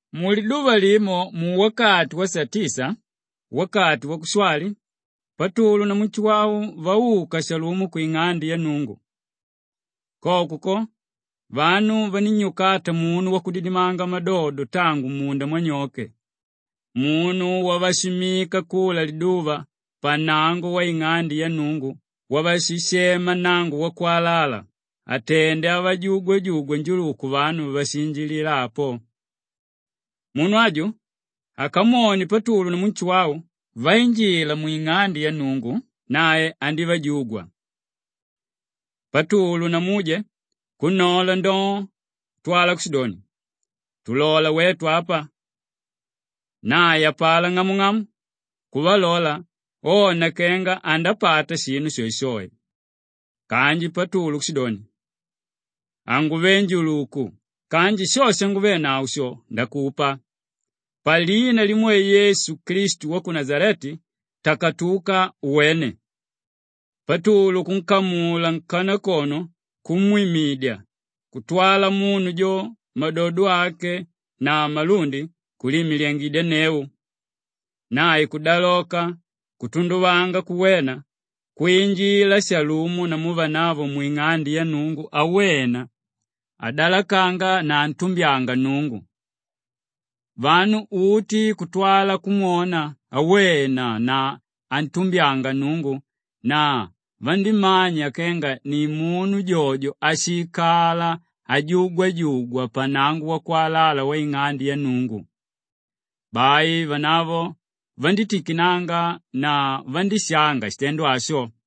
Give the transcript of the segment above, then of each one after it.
Muliduva limo muwakati wasatisa wakati wakushwali, Patulu namu Nshuwau vauka shalumo kwing'ande ya Nnungu. Koko ko, vanu vanínnyukata munu wakudidimanga madodo tangu mmunda mwanyoke, munu wavashimmika kula liduva pannango waing'ande ya Nnungu wavashishema Nnango-wakwalala atende avajugwajugwa njuluku vanu váshiinjilila apo. Munu aju akamwone Patulu namu Nshuwau vainjila mwing'ande ya Nnungu nae andívajugwa. Patulu na muje kunnola ndoo, kutwala kushidoni, “Tulola wetu apa!” Nae apalá, ng'amung'amu, kuvalola ona kenga andapata shinu shoeshoe. Kanji Patulu kushidoni, “Hanguve njuluku kanji sho shanguvenavo sho ndakupa; palina limwe Yesu Klistu wa ku Nashaleti, takatuka uwene!” Patulu kunkamula nkanakono kumwimidya kutwala munu jo madodo ake na malundi, kuliimiliyangidyanneu. Nae kudaloka kutunduvanga kuwena, kwinjila shalumo namu vanavo mwing'ande ya Nnungu awena, adalakanga na antumbyanga Nnungu. Vanu uti kutwala kumwona awena na antumbyanga Nnungu na vandímanya kenga ni munu jojo áshiikala ajugwajugwa pa Nnango-wakwalala waing'ande ya Nnungu. Bai vanavo vandítikinanga na vandíshanga shitendo asho.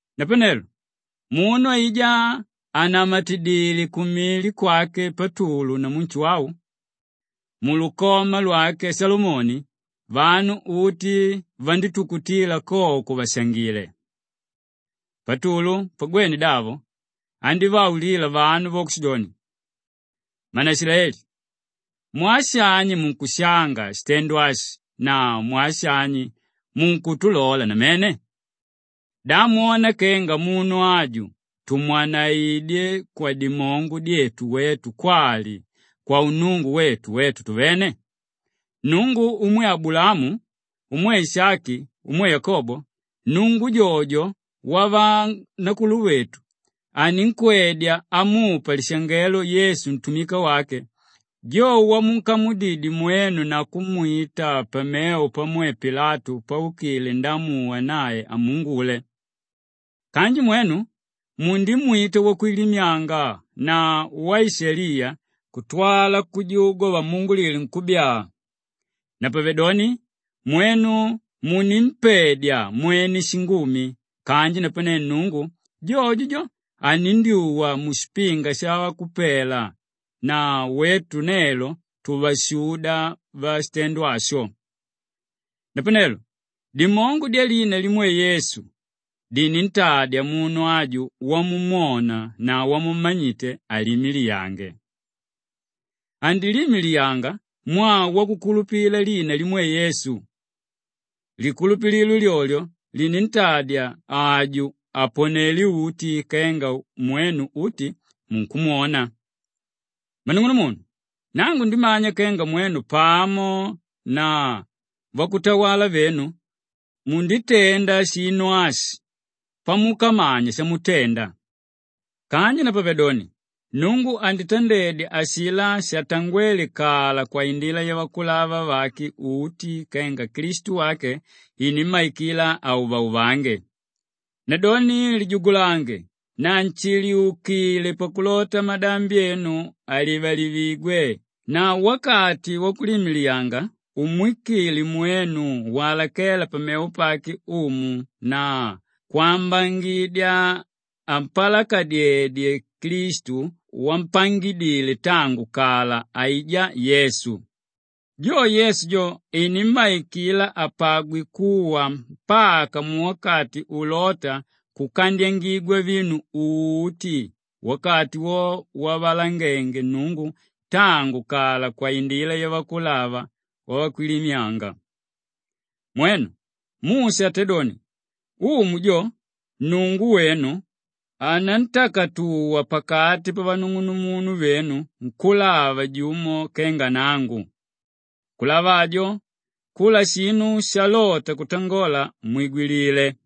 Napanelo munu aijá ànamatidile kumili kwake Patulu namu Nshuwau mulukoma lwake Shalomoni, vanu uti vandítukutila koko vàshangile. Patulu pagwene davo, andívaulila vanu avo kushidoni, “Mmanaishilaeli! Mwaa shani munkushanga shitendo ashi na mwaa shani munkutulola namene? Da mwona kenga munu aju tumwanaidyé kwadimongo dyetu wetu kwali kwaunnungu wetu wetu tuvene? Nnungu umwe Abulaamu, umwe Ishaki, umwe Yakobo, Nnungu jojo wavanakuluvetu aninkwedya amupa lishangelo Yesu ntumika wake, jo wamunkamudidye mwenu na kumwita pamevo pamwe Pilatu paukile ndaamuwa nae amuungule. Kanji mwenu mundimwita Wakwilimyanga na Waishaliya kutwala kujugwa vamuungulile nkúbyaa. Napavedoni, mwenu munimpedya mwene shingumi kanji napane Nnungu, jojo jo, anindyuwa mushipinga shavakupela na wetu nelo tuvashuda vashitendo asho. Napanelo dimongo dyalina limwe Yesu dinintadya munu aju wamumwona na wamummanyite, aliimiliyange. Andiliimiliyanga mwaa wakukulupila lina limwe Yesu; likulupililo lyolyo linditadya aju aponele uti kenga mwenu uti munkwona. Mmanung'unumunu, nangu ndimanya kenga mwenu pamo na vakutawala venu munditenda shinu ashi pamukamanya shamutenda. Kanji napavedoni, Nnungu anditandedya ashilá shatangwéle kala kwaindila yavakulava vake uti kenga Klistu wake inimmaikila auvauvange. Nadoni lijugulange na nshiliukile pakulota madambi enu alivalivigwe na wakati wakuliimiliyanga umwikile mwenu walakela pamevo pake Umu na kwambangidya ampalakadyedye Klistu wampangidile tangu kala, aijá Yesu. Jo Yesu jo inimmaikila apagwe kuwa mpaka muwakati ulóta kukandyangigwa vinu uti, wakati wowo wavalangenge Nnungu tangu kala kwaindila yavakulava vakwilimyanga. Mwenu, Musha atédoni, ‘Umu, jo Nnungu wenu anantakatuwa pakati pavanung'unumunu venu nkúlava jumo kenga nangu. Nkúlava ajo, kula shinu shalota kutangola, mwigwilile.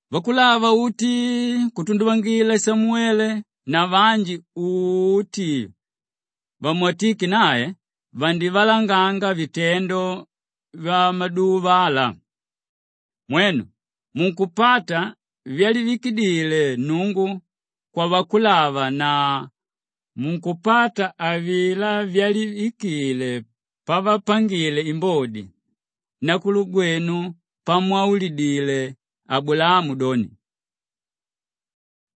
“Vakulava uti kutunduvangila Samuwele na vanji uti vamwatíke nae vandivalanganga vitendo vyamaduva ala. Mwenu munkupata vyalivikile Nnungu kwavakulava na munkupata avilá vyalivikile pavapangile imbodi vanakuluvenu pamwaulidile Abulaamu doni,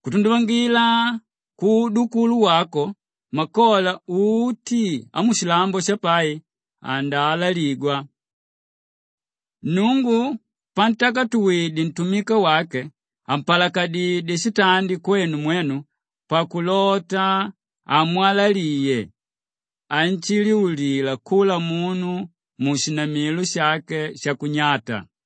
‘Kutunduvangila kuudukulu wako makola uti amushilambo shapai andaalaligwa.’ Nnungu pantakatuwidye ntumika wake, ampalakadidyé shitandi kwenu mwenu pakulota amwalaliye anshinjiula kula munu mushinamilo shake shakunyata.”